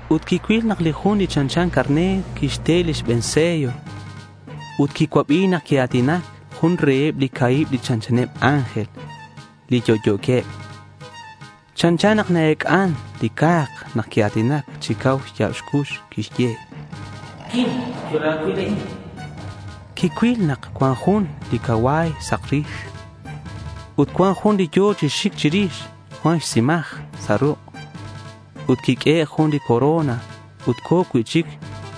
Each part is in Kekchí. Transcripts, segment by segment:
Ut quicuil nak li Jun li chanchan carner quixte li xbe̱n sello. Ut quicuabi nak quia̱tinac jun reheb li ca̱hib li chanchaneb ángel, li yo'yo̱queb. Chanchan nak na-ec'an li ca̱k nak quia̱tinac chi cau xya̱b xcux. Quixye: —¡Quim! Chola̱cuil a'in, chan. Quicuil nak cuan jun li cacua̱y sak rix. Ut cuan jun li yo̱ chi xic chirix cuan xtzimaj sa' ruk'. Ut quiq'uehe' jun lix corona ut co̱ cui'chic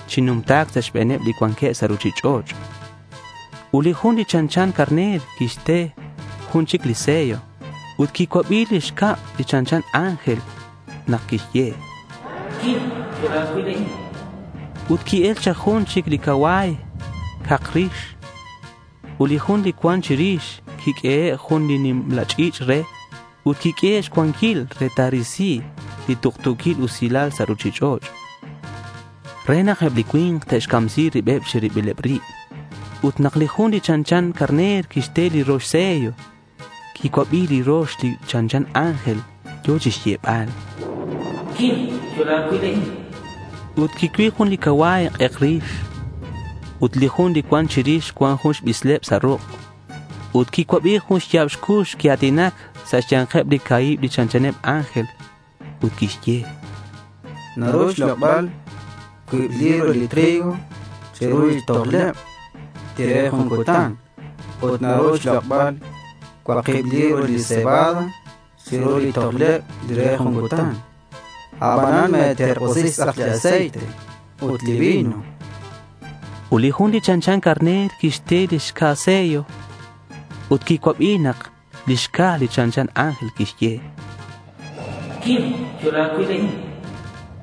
chi numta̱c sa' xbe̱neb li cuanqueb sa' ruchich'och'. Ut li Jun li chanchan carner quixte jun chic li sello ut quicuabi li xcab li chanchan ángel nak quixye: —¡Quim! ¡Chola̱cuil a'in! chan. Ut qui-el chak jun chic li cacua̱y cak rix. Ut li jun li cuan chirix quiq'uehe' jun li nimla ch'i̱ch' re ut quiq'uehe' xcuanquil re ta̱risi li tuktu̱quil usilal sa' ruchich'och' re nak eb li cui̱nk te'xcamsi ribeb chi ribileb rib. Ut nak li Jun li chanchan carner quixte li rox sello, quicuabi li rox li chanchan ángel yo̱ chixyebal: —¡Quim! Chola̱cuil a'in, chan. Ut quicuil jun li cacua̱y k'ek rix. Ut li jun li cuan chirix cuan jun li bisleb sa' ruk'. Ut quicuabi jun xya̱b cux quia̱tinac sa' xya̱nkeb li ca̱hib li chanchaneb ángel ut quixye: —Naru xlok'bal cuib libra li trigo chiru li tojleb li re jun cutan ut naru xlok'bal cuakib libra li cebada chiru li tojleb li re jun cutan. Abanan me̱terk'usi xtz'ak li aceite ut li vino, chan. Ut li Jun li chanchan carner quixte li xca̱ sello ut quicuabi nak li xca̱ li chanchan ángel quixye: —¡Quim! Chola̱cuil a'in, chan.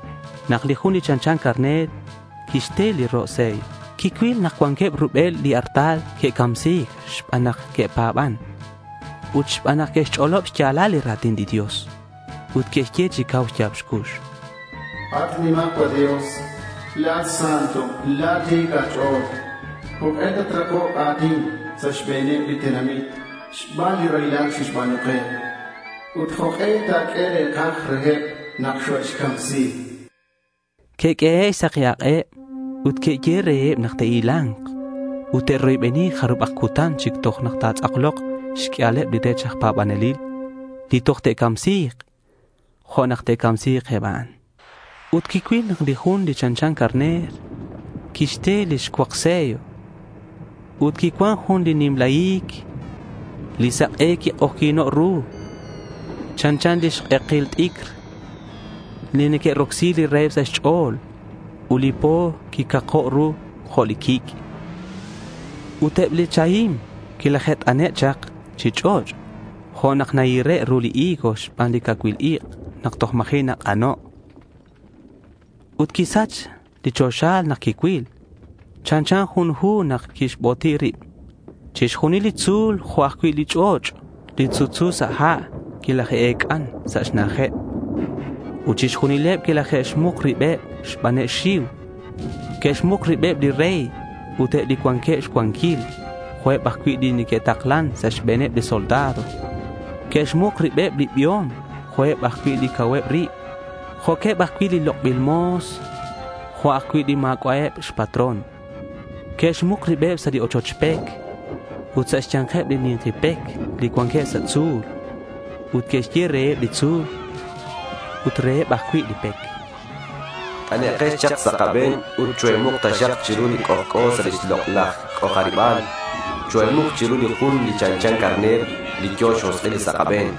Nak li Jun li chanchan carner quixte li ro' sello, quicuil nak cuanqueb rubel li artal li que'camsi̱c xban nak que'pa̱ban ut xban nak que'xch'olob xya̱lal li ra̱tin li Dios. Ut que'xye chi cau xya̱b xcux: —At nimajcual Dios, la̱at Santo ut la̱at ti̱c a̱ch'o̱l. ¿Jok'e tatrakok a̱tin sa' xbe̱neb li tenamit xban li raylal xe'xba̱nu ke? Ut, ¿jok'e ta̱q'ue re̱kaj reheb nak xoe'xcamsi? chanqueb. Que'q'uehe' xsaki ak'eb. Ut que'yehe' reheb nak te'hila̱nk ut te'roybeni jarubak cutan chic toj ta̱tz'aklok xq'uialeb li rech aj c'anjelil li toj te'camsi̱k jo' nak que'camsi̱c eb a'an. Ut quicuil nak li Jun li chanchan carner quixte li xcuak sello ut quicuan jun li nimla hi̱c. Li sak'e quik'ojyi̱no' ru. Chanchan li k'eki t'icr li neque'rocsi li raheb sa' xch'o̱l. Ut li po quicako' jo' li quic'. Ut eb li chahim quilaje't'ane' chak chi ch'och' jo' nak nahire' ru li higo xban li cacuil ik' nak toj ma̱ji' nak'ano'. Ut quisach li choxa nak quicuil. Chanchan jun li hu nak quixboti rib. Chixjunil li tzu̱l jo' ajcui' li ch'och' li sutsu sa' ha' quilaje'ec'an sa' xna'ajeb. Ut chixjunileb quilaje'xmuk ribeb xbaneb xxiu. Que'xmuk ribeb li rey ut eb li cuanqueb xcuanquil, jo'queb ajcui' li neque'taklan sa' xbe̱neb li soldado. Que'xmuk ribeb li biom jo'queb ajcui' li cauheb rib, jo'queb ajcui' li lok'bil mo̱s jo' ajcui' li ma̱c'a'eb xpatrón. Que'xmuk ribeb sa' li ochoch pec ut sa' xya̱nkeb li ni̱nki pec li cuanqueb sa' tzu̱l. Ut que'xye reheb li tzu̱l ut reheb ajcui' li pec: —T'anekex chak sa' kabe̱n ut choe̱muk taxak chiru li c'ojc'o sa' lix lok'laj c'ojariba̱l. Choe̱muk chiru li Jun li chanchan carner, li yo̱ xjosk'il sa' kabe̱n.